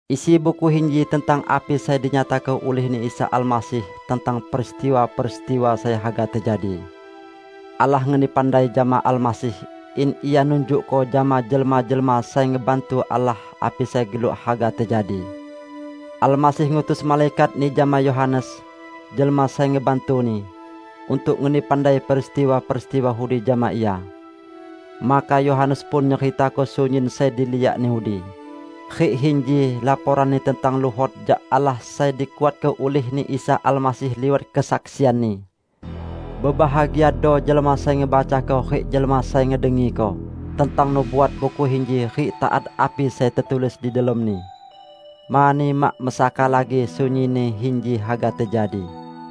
Isi buku inji tentang api sai dinyatako ulih-Ni Isa Almasih tentang peristiwa-peristiwa sai haga tejadi. Allah ngeni pandai jama Almasih in Ia nunjukko jama jelma-jelma sai ngebantu Allah api sai geluk haga tejadi. Almasih ngutus malaikat-Ni jama Yohanes, jelma sai ngebantu-Ni, untuk ngeni pandai peristiwa-peristiwa udi jama ia. Maka Yohanes pun nyeritako sunyin sai diliakni udi; rik inji laporanni tentang luhot jak Allah sai dikuatko ulih-Ni Isa Almasih liwat kesaksian-Ni. Bebahagiado jelma sai ngebacako rik jelma sai ngedengiko tentang nubuat buku inji rik taat api sai tetulis di delomni. Mani mak mesaka lagi sunyinni inji haga tejadi.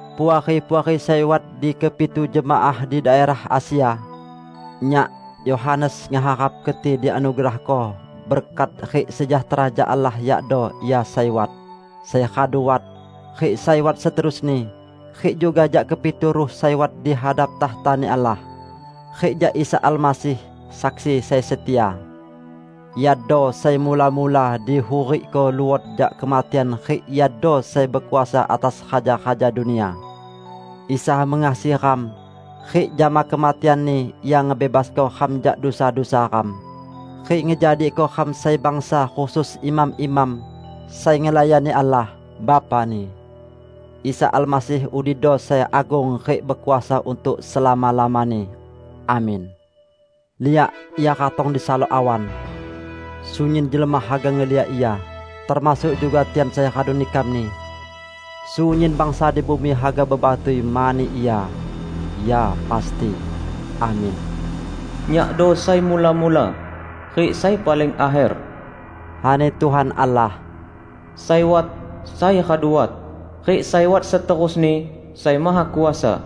Puari-puari sai wat di kepitu jemaah di daerah Asia! Nyak, Yohanes, ngeharap keti dianugerahko berkat rik sejahtera jak Allah -- yakdo Ia sai wat, sai radu wat, rik sai wat seterusni -- rik juga jak kepitu ruh sai wat di hadap takhta-Ni Allah, rik jak Isa Almasih, saksi sai setia. Iado sai mula-mula dihurikko luot jak kematian rik Iado sai bekuasa atas raja-raja dunia. Isa mengasihi ram, rik jama kematian-Ni Ia ngebebasko ram jak dusa-dusa ram, rik ngejadiko ram sai bangsa khusus imam-imam, sai ngelayani Allah, Bapa-Ni. Isa Almasih udido sai agung rik bekuasa untuk selama-lamani. Amin! Liak, Ia ratong disalok awan! Sunyin jelma haga ngeliak Ia, termasuk juga tian sai radu nikam-Ni. Sunyin bangsa di bumi haga bebatui mani Ia. Ya, pasti! Amin! "Nyakdo sai mula-mula rik sai paling akher," ani Tuhan Allah, sai wat, sai radu wat, rik sai wat seterusni, Sai Mahakuasa.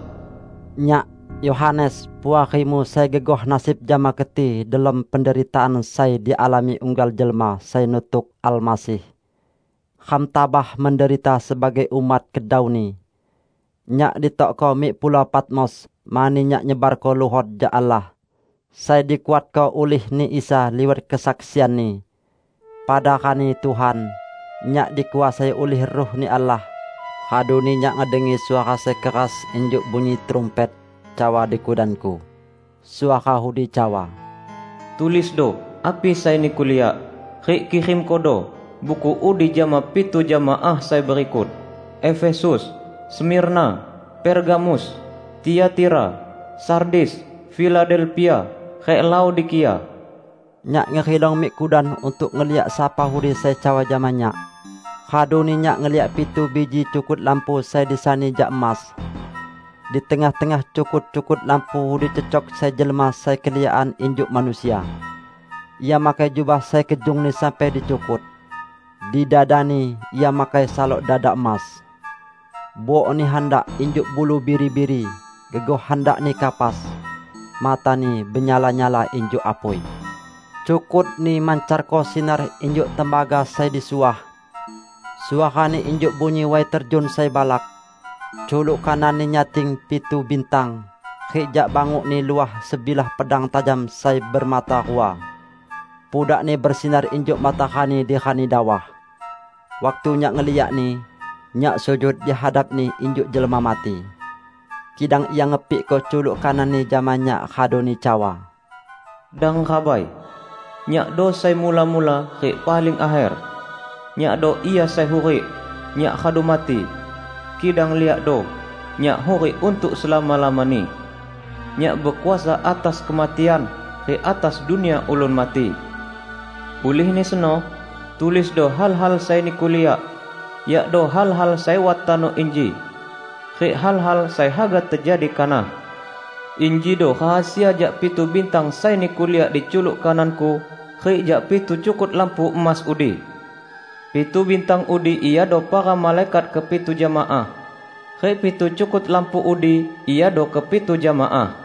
Nyak, Yohanes, puarimu sai gegoh nasib jama keti delom penderitaan sai dialami unggal jelma sai nutuk Almasih. Ram tabah menderita sebagai umat kedau-Ni. Nyak ditokko mik Pulau Patmos mani nyak nyebarko luhot jak Allah, sai dikuatko ulih-Ni Isa liwat kesaksian-Ni. Pada rani Tuhan, nyak dikuasai ulih Ruh-Ni Allah, raduni nyak ngedengi suara sai keras -- injuk bunyi trumpet -- cawa di kudanku. Suara udi cawa, "Tulisdo api sai niku liak, rik kirimkodo buku udi jama pitu jemaah sai berikut: Efesus, Smirna, Pergamus, Tiatira, Sardis, Filadelpia rik Laodikia." Nyak ngerilong mik kudan untuk ngeliak sapa udi sai cawa jama nyak. Raduni nyak ngeliak pitu biji cukut lampu sai disani jak emas. Di tengah-tengah cukut-cukut lampu udi cecok sai jelma sai keliakan injuk manusia. Ia makai jubah sai kejungni sampai di cukut. Di dada-Ni Ia makai salok dada emas. Buok-Ni handak injuk bulu biri-biri, gegoh handakni kapas. Mata-Ni benyala-nyala injuk apui; cukut-Ni mancarko sinar injuk tembaga sai disuah. Suara-Ni injuk bunyi way terjun sai balak. Culuk kanan-Ni nyating pitu bintang, rik jak banguk-Ni luah sebilah pedang tajam sai bemata rua. Pudak-Ni besinar injuk matarani di rani dawah. Waktu nyak ngeliak-Ni, nyak sujud di hadap-Ni injuk jelma mati. Kidang Ia ngepikko culuk kanan-Ni jama nyak raduni cawa, "Dang rabai! Nyakdo sai mula-mula rik paling akher. Nyakdo Ia sai hurik! Nyak radu mati, kidang liakdo, Nyak hurik untuk selama-lamani. Nyak bekuasa atas kematian, rik atas dunia ulun mati. Ulihni seno, tulisdo hal-hal sai niku liak, yakdo hal-hal sai wat tano inji, rik hal-hal sai haga tejadi kanah. Injido rahasia jak pitu bintang sai niku liak di culuk kanan-Ku, rik jak pitu cukut lampu emas udi: Pitu bintang udi iado para malaikat kepitu jemaah, rik pitu cukut lampu udi iado kepitu jemaah."